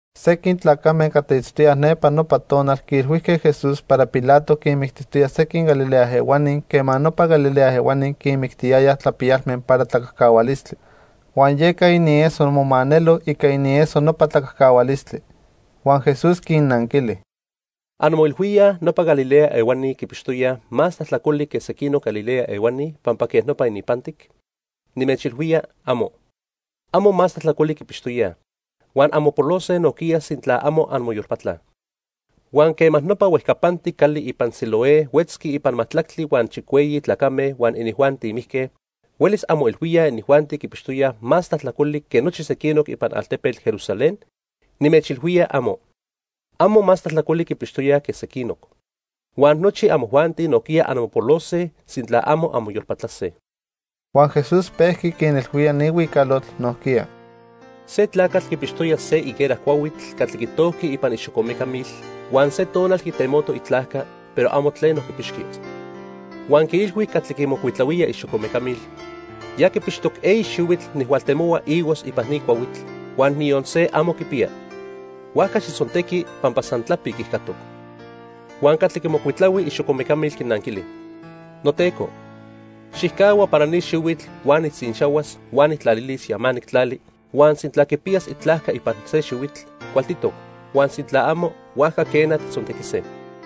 Sequin tlacame catli itztoyaj nepa nopa tonal quiilhuijque Jesús para Pilato quinmictijtoya sequin Galilea ehuani quema nopa Galilea ehuani quinmictiyayaj tlapiyalme para tlacajcahualistli. Huan yeca inieso momanelo ica inieso nopa tlacajcahualistli. Huan Jesús quinnanquili: "¿Anmoilhuíaj nopa Galilea ehuani quipixtoyaj más tlajtlacoli que sequinoc Galilea ehuani pampa quej nopa ininpantic? Nimechilhuía, amo. Amo más tlajtlacoli quipixtoyaj, huan anmopolose nojquiya sintla amo anmoyolpatlaj. Huan quema nopa huejcapantic cali ipan Siloé huetzqui ipan majtlactli huan chicueyi tlacame huan inijuanti mijque, huelis anmoilhuíaj inijuanti quipixtoyaj más tlajtlacoli que nochi sequinoc ipan altepetl Jerusalén. Nimechilhuía, amo. Amo más tlajtlacoli quipixtoyaj que sequinoc, huan nochi amojuanti nojquiya anmopolose, sintla amo anmoyolpatlase." Huan Jesús pejqui quinilhuía ni huicalotl nojquiya: "Se tlacatl quipixtoya se higuera cuahuitl catli quitojqui ipan ixocomecamil huan se tonal quitemoco itlajca, pero amo tleno quipixqui. Huan quiilhui catli quimocuitlahuía ixocomecamil: 'Ya quipixtoc eyi xihuitl nijhualtemohua higos ipan ni cuahuitl, huan niyon se amo quipiya, huajca xijtzontequi pampa san tlapic ijcatoc.' Huan catli quimocuitlahui ixocomecamil quinanquili: 'Noteco, xijcahua para ni xihuitl huan nijtzinxahuas huan nijtlalilis yamanic tlali, huan sintla quipiyas itlajca ipan se xihuitl, cualtitoc, huan sintla amo, huajca quena, tijtzontequise.' "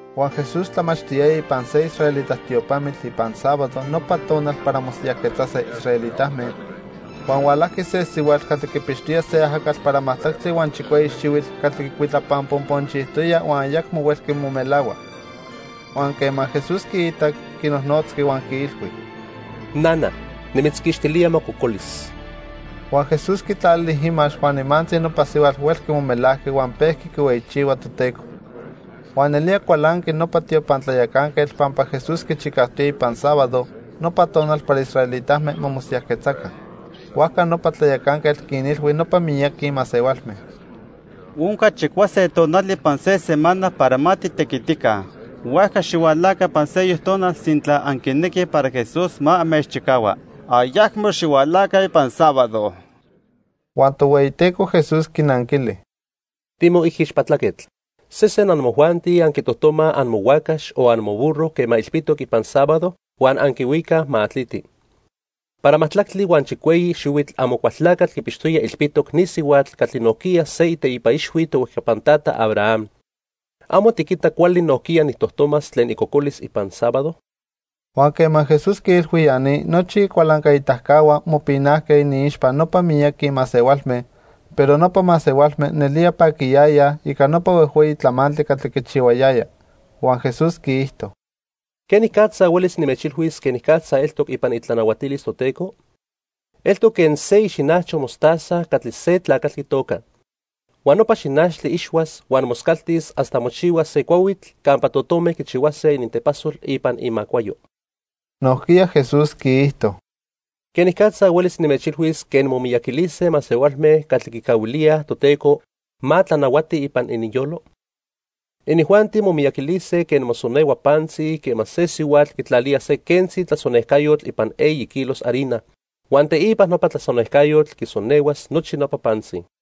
Huan Jesús tlamachtiyaya ipan se israelita tiopamitl ipan sábado nopa tonal para mosiyajquetzase israelitame, huan hualajqui se sihuatl catli quipixtoya se ajacatl para majtlactli huan chicueyi xihuitl catli quicuitlapanponponchijtoya huan ayacmo huelqui momelahua. Huan quema Jesús quiitac, quinojnotzqui huan quiilhui: —Nana, nimitzquixtilía mococolis. Huan Jesús quitlalili imax huan nimantzi nopa sihuatl huelqui momelajqui huan pejqui quihueyichihua Toteco. Huan nelía cualanqui nopa tiopan tlayacanquetl pampa Jesús quichicajtoya ipan sábado, nopa tonal para israelitame ma mosiyajquetzaca. Huajca nopa tlayacanquetl quinilhui nopa miyaqui masehualme: —Onca chicuase tonali ipan se semana para ma titequitica, huajca xihualaca ipan seyoc tonal sintla anquinequij para Jesús ma anmechchicahua. Ayacmo xihualaca ipan sábado. Huan Tohueyiteco Jesús quinanquili: —Timoijixpatlaquetl. Sesen amojuanti anquitojtomaj amohuacax o amoburro quema ilpitoc ipan sábado, huan anquihuicaj ma atliti. Para majtlactli huan chicueyi xihuitl Amocualtlacatl quipixtoya ilpitoc ni sihuatl catli nojquiya se iteipa ixhui tohuejcapan tata Abraham. ¿Amo tiquita cuali nojquiya nijtojtomas tlen icocolis ipan sábado? Huan quema Jesús quiilhui ya ni, nochi icualancaitacahua mopinajque iniixpa nopa miyaqui masehualme, pero nopa masehualme nelía paquiyayaj ica nopa huejhueyi tlamantli catli quichihuayaya. Huan Jesús quiijto: "¿Quenicatza huelis nimechilhuis quenicatza eltoc ipan itlanahuatilis Toteco? Eltoc quen se ixinajcho mostaza catli se tlacatl quitoca. Huan nopa xinachtli ixhuas huan moscaltis hasta mochihuas se cuahuitl campa totome quichihuase inintepasol ipan imacuayo." Nojquiya Jesús quiijto: "¿Quenicatza huelis nimechilhuis quen momiyaquilise masehualme catli quicahuilíaj Toteco ma tlanahuati ipan ininyolo? Inijuanti momiyaquilise quen mosonehua pantzi quema se sihuatl quitlalía se quentzi tlasonejcayotl ipan eyi kilos harina, huan teipa nopa tlasonejcayotl quisonehuas nochi nopa pantzi."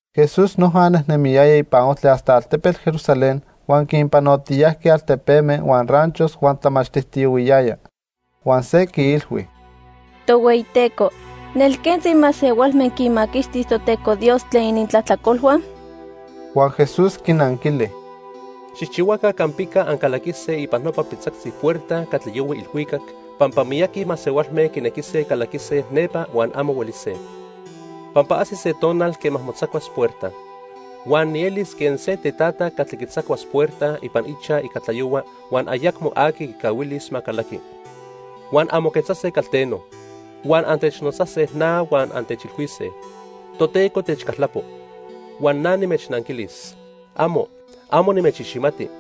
Jesús noja nejnemiyaya ipan ojtli hasta altepetl Jerusalén huan quinpanotiyajqui altepeme huan ranchos huan tlamachtijtiyohuiyaya. Huan se quiilhui: —Tohueyiteco, ¿nelquentzi masehualme quinmaquixtis Toteco Dios tlen inintlajtlacolhua? Huan Jesús quinanquili: —Xijchihuaca campica ancalaquise ipan nopa pitzactzi puerta catli yohui ilhuicac, pampa miyaqui masehualme quinequise calaquise nepa huan amo huelise. Pampa ajsis se tonal quema motzacuas puerta. Huan nielis quen se tetata catli quitzacuas puerta ipan ichaj ica tlayohua huan ayacmo aqui quicahuilis ma calaqui. Huan anmoquetzase calteno, huan antechnotzase na huan antechilhuise: 'Toteco, techcaltlapo', huan na nimechnanquilis: '¡Amo! Amo nimechiximati,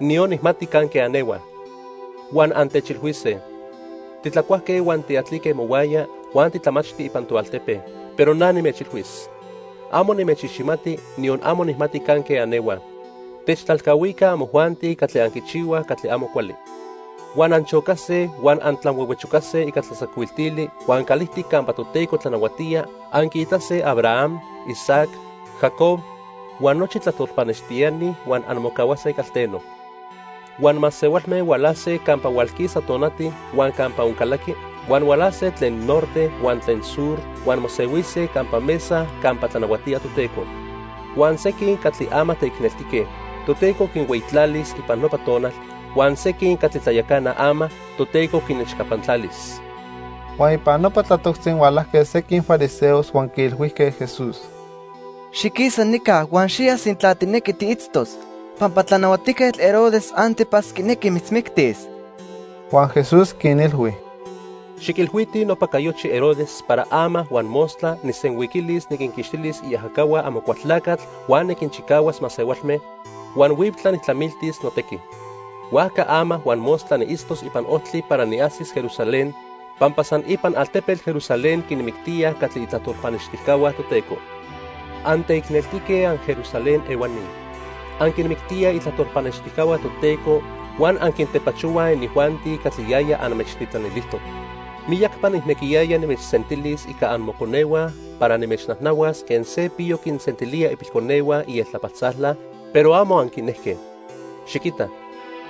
niyon nijmati canque anehuaj.' Huan antechilhuise: 'Titlacuajque huan tiatlique mohuaya, huan titlamachti ipan toaltepe', pero na nimechilhuis: 'Amo nimechiximati, niyon amo nijmati canque anehuaj. Techtlalcahuica amojuanti catli anquichihuaj catli amo cuali.' Huan anchocase huan antlanhuehuechocase ica tlatzacuiltili huan calijtic campa Toteco tlanahuatía anquiitase Abraham, Isaac, Jacob huan nochi tlajtol pannextiani, huan anmocahuase calteno. Huan masehualme hualase campa hualquisa tonati huan campa oncalaqui, huan hualase tlen norte huan tlen sur huan mosehuise campa mesa campa tlanahuatía Toteco. Huan sequin catli ama teicneltique, Toteco quinhueyitlalis ipan nopa tonal, huan sequin catli tlayacanaj ama, Toteco quinechcapantlalis. Huan ipan nopa tlatoctzi hualajque sequin fariseos huan quiilhuijque Jesús: —Xiquisa nica huan xiya sintla tijnequi tiitztos, pampa Tlanahuatijquetl Herodes 'Antipas quinequi mitzmictis. Huan Jesús quinilhui: —Xiquilhuitij nopa cayochi Herodes para ama huan mostla nijsenhuiquilis niquinquixtis iajacahua Amocualtlacatl huan niquinchicahuas masehualme, huan huiptla nijtlamiltis notequi. Huajca ama huan mostla niitztos ipan ojtli para niajsis Jerusalén, pampa san ipan altepetl Jerusalén quinmictíaj catli itlajtol pannextijcahua Toteco. "¡Anteicneltique anJerusalén ehuani! Anquinmictíaj itlajtol pannextijcahua Toteco huan anquintepachohuaj inijuanti catli yaya anmechtitlanilijtoc. Miyacpa nijnequiyaya nimechsentilis ica amoconehua para nimechnajnahuas quen se piyo quinsentilía ipilconehua ieltlapaltzala, pero amo anquinejque. Xiquita,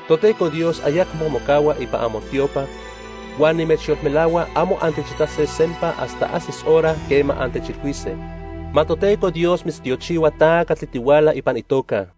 Toteco Dios ayacmo mocahua ipan amotiopa, huan nimechyolmelahua amo antechitase sempa hasta ajsis hora quema antechilhuise: 'Ma Toteco Dios mitztiochihua ta catli tihuala ipan itoca.' "